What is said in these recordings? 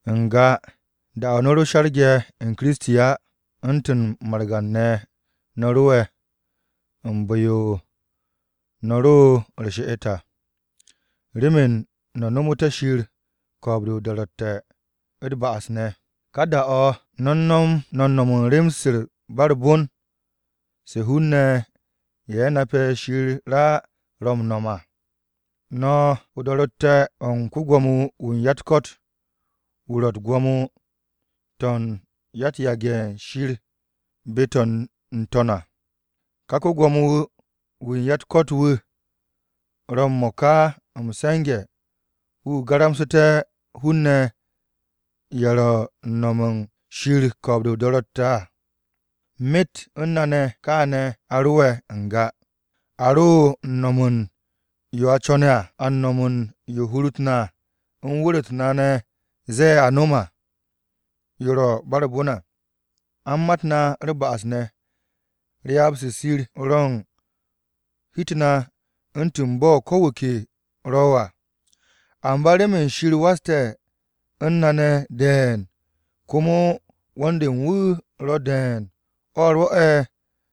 N-ga da-o̱ no̱ ro she̱rge̱ u̱n Kiristi á, u̱ntu̱n margan-ne̱ no̱ ro'e̱ u̱n bu̱-yo no̱ ro u̱r-she'et à, remen no̱ no̱mo̱te̱ Shir ko̱o̱b-de o-do̱ro̱tte̱ u̱t-ba'as ne̱. Ka da-o̱ no̱ u̱n no̱m u̱n rem-se u̱n ba u̱r-bon se hun-ne̱ ye̱ nape̱ Shir á ro̱ m-no̱m à. No̱ o-do̱ro̱tte̱ o̱ u̱n ko-Gwo̱mo-wu̱ u̱n ya-u̱t-ko̱t wu̱ ro̱ u̱t-gwo̱mo to̱ u̱n ya-u̱t-yage̱ to̱ u̱n Shir be-to̱ n-to̱n à. Ka ko-Gwo̱mo-wu̱ u̱n ya-u̱t-ko̱t wu̱ ro̱ m-mo̱ka m-se̱nge̱ wu̱ garamsu̱te̱ hun-ne̱ ye̱ ro̱ u̱n no̱me̱ u̱n Shir ko̱o̱b-de o-do̱ro̱tte̱ à. Myet u̱n na ne̱ kaane̱ a ro'e̱ n-ga, a ro u̱n no̱m u̱n yo a co̱ne̱ à. A u̱n no̱m u̱n yo hur-u̱t na u̱n wu̱r-u̱t na ne̱ ze̱e̱ a no̱m, yo ro̱ ba u̱r-bon à. A u̱n mat na u̱r-ba'as ne̱. Ryaab-se Shir ro u̱n hi-u̱t na u̱ntu̱n bo̱ ko̱ wu̱ ke ro̱ à. Amba remen Shir waste̱ u̱n na ne̱ de̱e̱n komo 'wo̱n-de u̱n wu̱ ro̱ de̱e̱n o̱ rwo̱'e̱,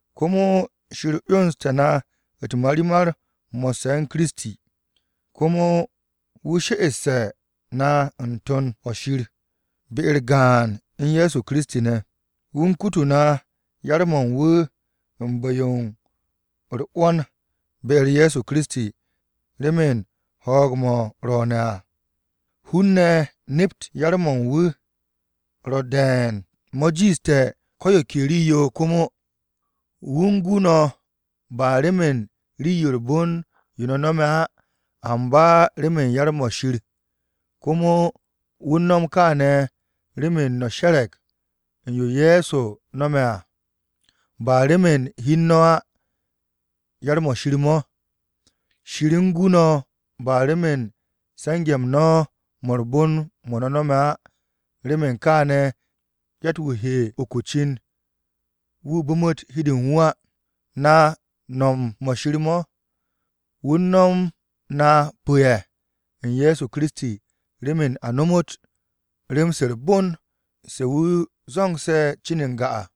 Komo Shir 'yonste̱ na u̱t-marimar mo̱sse̱ u̱n Kiristi ne̱. Komo wu̱ she'esse̱ na n-To̱n o-shir be-u̱r gaan u̱n Ye̱so Kiristi ne̱. Wu̱ u̱n kutu na yar-mo̱ u̱n wu̱ u̱n bu̱-yo u̱r-'wo̱n be-u̱r Ye̱so Kiristi, remen ho̱o̱g-mo̱ ro̱o̱ne̱ à hun-ne̱ nept yar-mo̱ u̱n wu̱ ro̱ de̱e̱n mo̱ jiishte̱ ko̱ yo ke rii-yo komo. Wu̱ u̱n gu no̱ ba remen rii-yo u̱r-bon yo no̱ no̱me̱ á, amba remen yar-mo̱ Shir. Komo wu̱ u̱n no̱m kááne̱ remen no̱ she̱re̱g u̱n yo Ye̱so no̱me̱ à, ba remen hi u̱n no̱ á, yar-mo̱ Shir mo̱. Shir u̱n gu no̱ ba remen se̱nge̱-m no̱ mo̱ u̱r-bon mo̱ no̱ no̱me̱ á, remen kaane̱, yatt-wu̱ he uk o-cin wu̱ bu̱mu̱t hi u̱n de u̱n wu̱ á. Na no̱m-mo̱ Shir mo̱. Wu̱ u̱n no̱m na pu̱-ye̱ u̱n Ye̱so Kiristi, remen a nomot rem-se u̱r-bon se wu̱ zo̱ngse̱ cin n-ga à.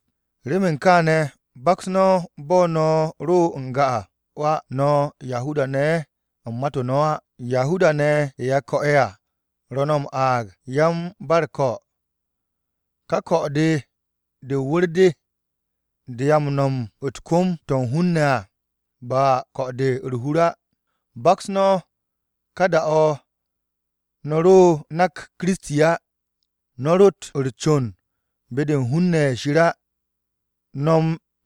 Remen kaane̱, baks no̱ bo̱ no̱ ro n-ga à, no̱ Yahuda-ne̱ ye̱ u̱n mat-o no̱ á. Yahuda-ne̱ ye̱ a ko̱'e̱ à, ro̱ no̱ m-aag “Yan-ba-u̱r-ko̱.” Ka ko̱-de de o-wu̱r de, de a m-no̱m u̱t-kom to̱ u̱n hun-ne̱ à, ba ko̱-de u̱r-hur á. Baks no̱ ka da-o̱ no̱ ro nak Kiristi á. No̱ rott u̱r-con be-de u̱n hun-ne̱ ye̱ Shir á. No̱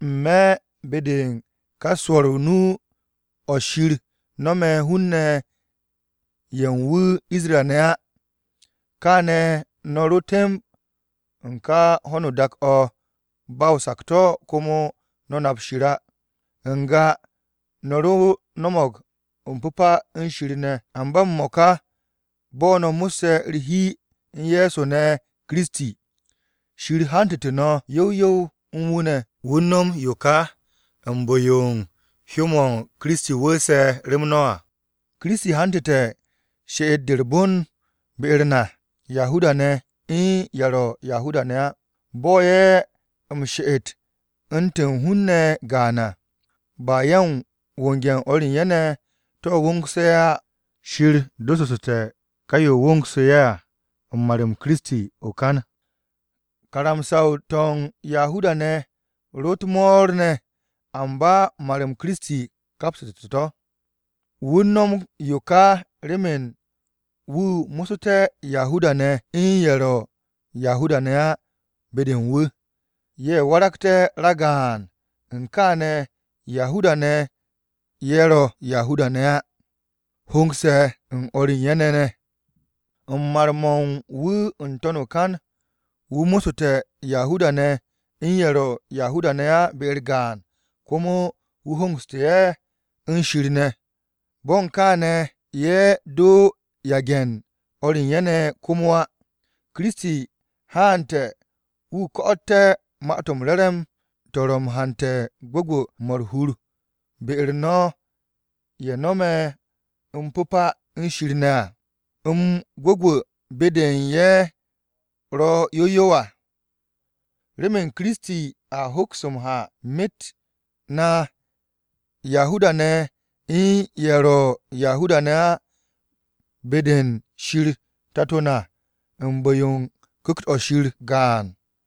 n-me̱ be-de u̱n ka swo̱r nu-o̱ Shir nome̱ hun-ne̱ u̱n ye̱ u̱n wu̱ Isra-ne̱ á. Kaane̱ no̱ ro temb u̱n ka ho̱no o-dak o̱ ba o-sakto̱ komo no̱ nap Shir á. N-ga no̱ ro no̱mo̱g m-pu̱pa u̱n Shir ne̱, amba m-mo̱ka bo̱ no̱ mo̱sse̱ u̱r-hi u̱n Ye̱so Kiristi ne̱ à, Shir hantu̱tu̱ no̱ yow yow u̱n wu̱ ne̱. Wu̱ u̱n no̱m yo ka u̱n bu̱-yo u̱n hyó-mo̱Kiristi wu̱u̱se̱ rem no̱ à. Kiristi hantu̱te̱ she'et-de u̱n gwu̱gwu̱-mo̱ u̱r-hur be-u̱r na Yahuda-ne̱ u̱n ye̱ ro̱ Yahuda-ne̱ á. Bo̱ ye̱ m-she'et u̱ntu̱n hun-ne̱ gaan à, ba ye̱ u̱n wonge̱ u̱n o̱r u̱n ye̱ ne̱, to̱ wongsu̱ ye̱ à, Shir dossu̱ssu̱te̱ ka yo wo̱o̱ngsu̱ ye̱ à u̱n mar-m Kiristi o-kan. Karamsa-to̱ u̱n Yahuda-ne̱ ro u̱t-mo̱o̱r ne̱, amba mar-m Kiristi kapste̱ to̱. Wu̱ u̱n no̱m yo ka remen wu̱ mo̱ssu̱té̱ Yahuda-ne̱ u̱n ye̱ ro̱ Yahuda-ne̱ ne̱ á be-de u̱n wu̱. Ye̱ waragte̱ ragaan, u̱n kaane̱ Yahuda-ne̱ u̱n ye̱ ro̱ Yahuda-ne̱ á honge̱ u̱n o̱r u̱n ye̱ ne̱ ne̱. U̱n mar-mo̱ u̱n wu̱ n-to̱n o-kan, wu̱ mo̱ssu̱te̱ Yahuda-ne̱ u̱n ye̱ ro̱ Yahuda-ne̱ á be-u̱r gaan. Komo wu̱ hongsu̱ ye̱ u̱n Shir ne̱. Bo̱ u̱n kaane̱ ye̱ do yage̱ u̱n o̱r u̱n ye̱ ne̱ komo á. Kiristi haante̱ wu̱ ko̱'o̱te̱ Ma-to̱ m-Re̱re̱m to̱ ro̱ m-hante̱ gwu̱gwu̱-mo̱ u̱r-hur be-u̱r no̱ ye̱ no̱me̱ m-pu̱pa u̱n Shir ne̱ à, m-gwu̱gwu̱ be-de u̱n ye̱ ro̱ yow yow à. Rem Kiristi, a hoks m-ha myet-m na (Yahuda-ne̱ u̱n ye̱ ro̱ Yahuda-ne̱ á) be-de u̱n Shir Tato na u̱n bu̱-yo u̱n Ku̱kt-o̱ Shir gaan.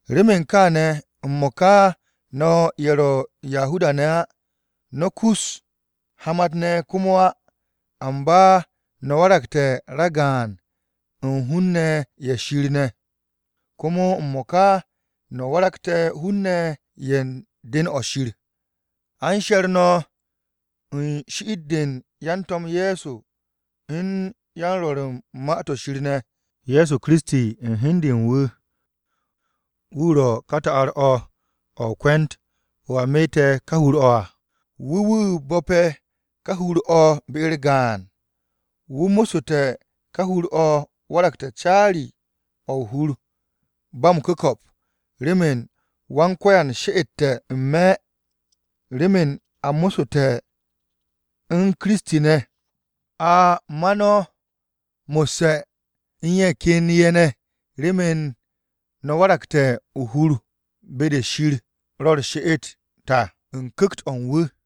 Remen kaane̱, m-mo̱ka no̱ ye̱ ro̱ Yahuda-ne̱ á no̱ kus hamat-ne̱ komo á, amba no̱ waragte̱ ragaan u̱n hun-ne̱ ye̱ Shir ne̱. Komo m-mo̱ka no̱ waragte̱ hun-ne̱ ye̱ u̱n den-o̱ Shir. A u̱n she̱r no̱ u̱n shi'it-de yan-To̱m Ye̱so, u̱n yan-Rwo̱r u̱n Ma-to̱ Shir ne̱. Ye̱so Kiristi u̱n hi u̱n de u̱n wu̱, wu̱ ro̱ ka ta'ar-o̱ o-kwu̱nt o̱ a meete̱ ka hur-o̱ à. Wu̱ wu̱ bo̱pe̱ ka hur-o̱ be-u̱r gaan. Wu̱ mo̱ssu̱te̱ ka hur-o̱ waragte̱ caari-o̱ Pyo-o̱ ba m-ku̱ko̱p, remen Wan-Ko̱yan she'ete̱ n-me̱. Remen a mo̱ssu̱te̱ u̱n Kiristi ne̱, a m-ma no̱ mo̱sse̱ u̱n ye̱ ken ye̱ ne̱ remen no̱ waragté̱ o-hur be-de Shir ro̱ u̱r-she'et à u̱n Ku̱kt-o̱ u̱n wu̱.